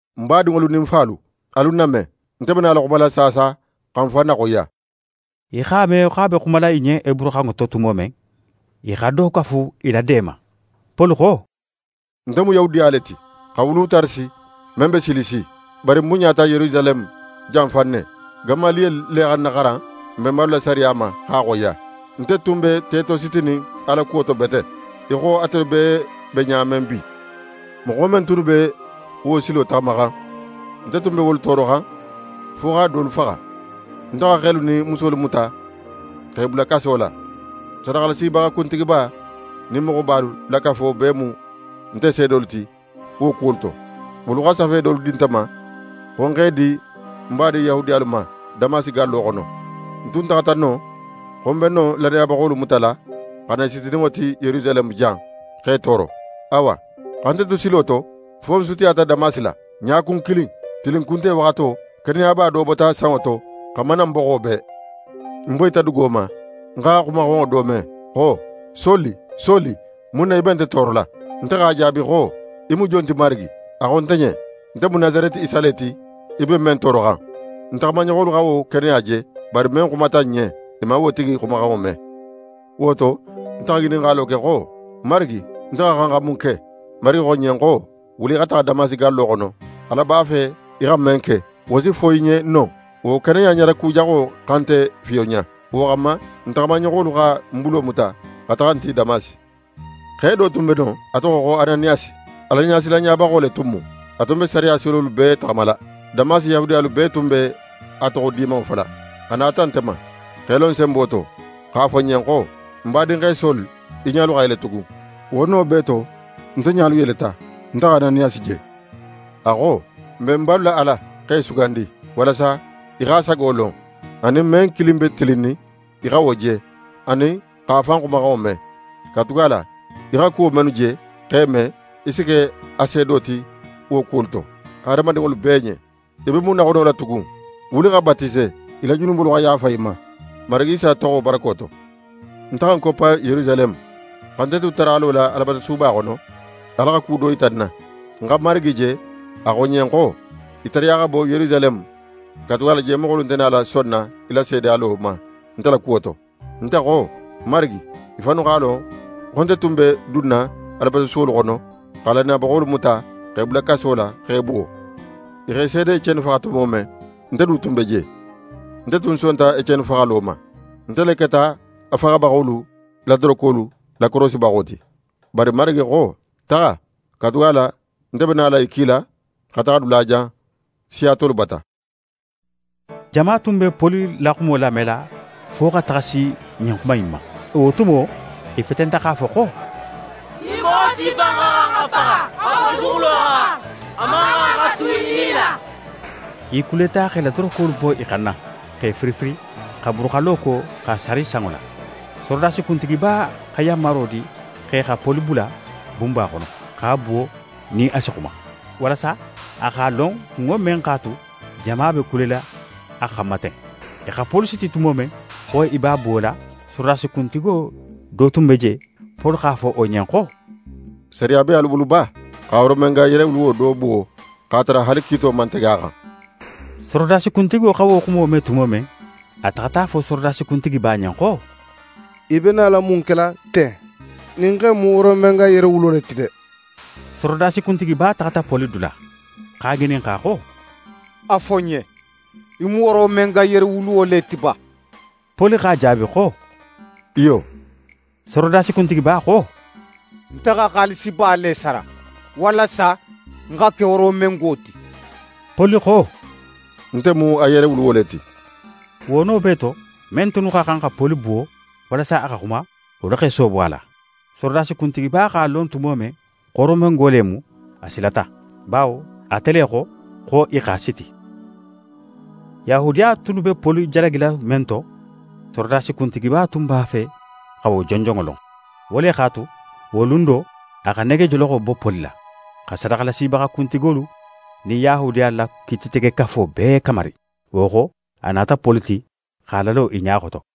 «Ń badinŋolu nin ń falu, alu ń name. Nte be nala xumala saasa xa ń fan naxoyiya.» I x'a me xo a be xumala i ɲen heburuxanŋo to tumo men, i xa do kafu i la de ma. Poli xo: «Nte mu Yahudiya le ti, xa wulu Tarasi men be Silisi. Bari ń bunɲata Yerusaleme jan fan ne. Gamaliyeli le xa ń naxaran n benbalu la sariya ma x'a xoyiya. Nte tun be tetositinin Ala kuwo to bete, í xo atelu bee be ɲa men bi. Moxo men tunnu be wo silo taxamaxan, nte tun be wolu tooroxan fo xa dolu faxa. Nte xa xelu nin musolu muta x'e bula kaso la. Sadaxalasibaxa kuntigiba nin moxobalu la kafo bee mu nte seedolu ti wo kuwolu to. Wolu xa safe dolu di nte ma xo ń x'e di n badin Yahudiyalu ma Damasi gallo xono. Ń tun taxata non xo ń be non lannayabaxolu mutala xa na i sitininŋo ti Yerusaleme jan, x'e tooro.» «Awa, xa nte tu silo to, fo ń sutiyata Damasi la, ɲakun kilin, tilinkunte waxato, keneyaba bota sanŋo to xa mana ń boxo bee. Ń boyita dugo ma, ń xa xumaxanŋo do me xo: “Soli, Soli, mun na í be nte toorola?” Nte x'a jaabi xo: “Í mu jon ti, Marigi?” A xo nte ɲen: “Nte mu Nasareti Isa le ti, í be men tooroxan.” Ń taxamaɲoxolu xa wo keneya je, bari men xumata ń ɲen, i man wo tigi xumaxanŋo me. Wo to, nte xa ŋininxalo ke xo: “Marigi, nte xa xan xa mun ke?” Marigi xo ń ɲen xo: “Wuli, í xa taxa Damasi gallo xono. Ala b'a fe í xa men ke, wo si fo í ɲen non.” Wo keneya ɲarakujaxo xa nte fiyonɲa. Wo xanma, nte taxamaɲoxolu xa ń bulo muta xa taxa ń ti Damasi. «Xe do tun be non, a toxo xo Ananiyasi, Alaɲasilanɲabaxo le tun mu. A tun be sariya silolu bee taxamala. Damasi Yahudiyalu bee tun be a toxo dimanŋo fola. A nata nte ma, x'é lo ń senbo to, x'a fo ń ɲen xo: “Ń badinxe Soli, í ɲalu xa yele tugun!” Wo no bee to, nte ɲalu yeleta, nte xa Ananiyasi je. A xo: “N benbalu la Ala x'é sugandi, walasa í x'a sago lon; anin men kilin be tilinnin, í xa wo je; anin x'a fan xumaxanŋo me. Katugala í xa kuwo mennu je, x'e me, í si ke a seedo ti wo kuwolu to, hadamadinŋolu bee ɲen. Í be mun naxonola tugun? Wuli xa batise, í la junubolu xa yaafa í ma, Marigi Isa toxo barako to.”» «Nte xa ń koppa Yerusaleme, xa nte tu taralo la Alabatusuba xono, Ala xa ku do yita ń na. Ń xa Marigi je, a xo ń ɲen xo: “Í tariya xa bo Yerusaleme, katugala je moxolu nte nala sonna í la seedeyalo ma nte la kuwo to.” Nte xo: “Marigi, i fannu x'a lon xo nte tun be dunna Alabatusuwolu xono xa lannayabaxolu muta x'e bula kaso la, x'e buwo. I x'é seede Eceni faxa tumo men, nte du tun be je. Nte tun sonta Eceni faxalo ma. Nte le keta a faxabaxolu la dorokolu lakorosibaxo ti.” Bari Marigi xo: “Taxa, katugala nte be nala í kila xa taxa dulajan, siya tolu bata!”» Jama tun be Poli la xumo lamela fo xa taxa si ɲin xuma in ma. Wo tumo, i fetenta x'a fo xo: «Ɲin moxo sifa in xa xan xa faxa xa bo duguxulo xan. A man xan xa tu í nila.» I kuleta x'e la dorokolu bo i xanna, x'e firifiri, xa buruxallo ko x'a sari sanŋo la. Sorodasi kuntigiba xa yanmaro di x'e xa Poli bula bunba xono, x'a buwo nin a si xuma, walasa a xa lon kunŋo men x'a tu jama be kulela a xanma ten. I xa Poli siti tumo men, xo i b'a buwola, sorodasi kuntigo do tun be je, Poli x'a fo wo ɲen xo: «Sariya be alu bulu ba xa Romenga yerewuluwo do buwo, x'a tara haali kiito man tege a xan?» Sorodasi kuntigo xa wo xumo me tumo men, a taxata a fo sorodasi kuntigiba ɲen xo: «Í be nala mun kela ten? Ɲin xe in mu Romenga yerewuluwo le ti de.» Sorodasi kuntigiba taxata Poli dula, x'a ŋininxa xo: «A fo ń ɲen, í mu Romenga yerewuluwo le ti ba?» Poli x'a jaabi xo: «Iyo.» Sorodasi kuntigiba xo: «Nte xa xaalisiba le sara, walasa ń xa ke Romengo ti.» Poli xo: «Nte mu a yerewuluwo le ti!» Wo no bee to, men tunnu xa xan xa Poli buwo, walasa a xa xuma, wolu x'e soobo a la. Sorodasi kuntigiba x'a lon tumo men xo Romengo le mu, a silata; bawo ate le xo xo i x'a siti. Yahudiya tunnu be Poli jalagila men to, sorodasi kuntigiba tun b'a fe xa wo jonjonŋo lon. Wo le x'a tu, wo lun do, a xa negejoloxo bo Poli la, xa sadaxalasibaxa kuntigolu nin Yahudiyalu la Kiititegekafo bee kamari. Wo xo, a nata Poli ti, x'a lalo i ɲa xoto.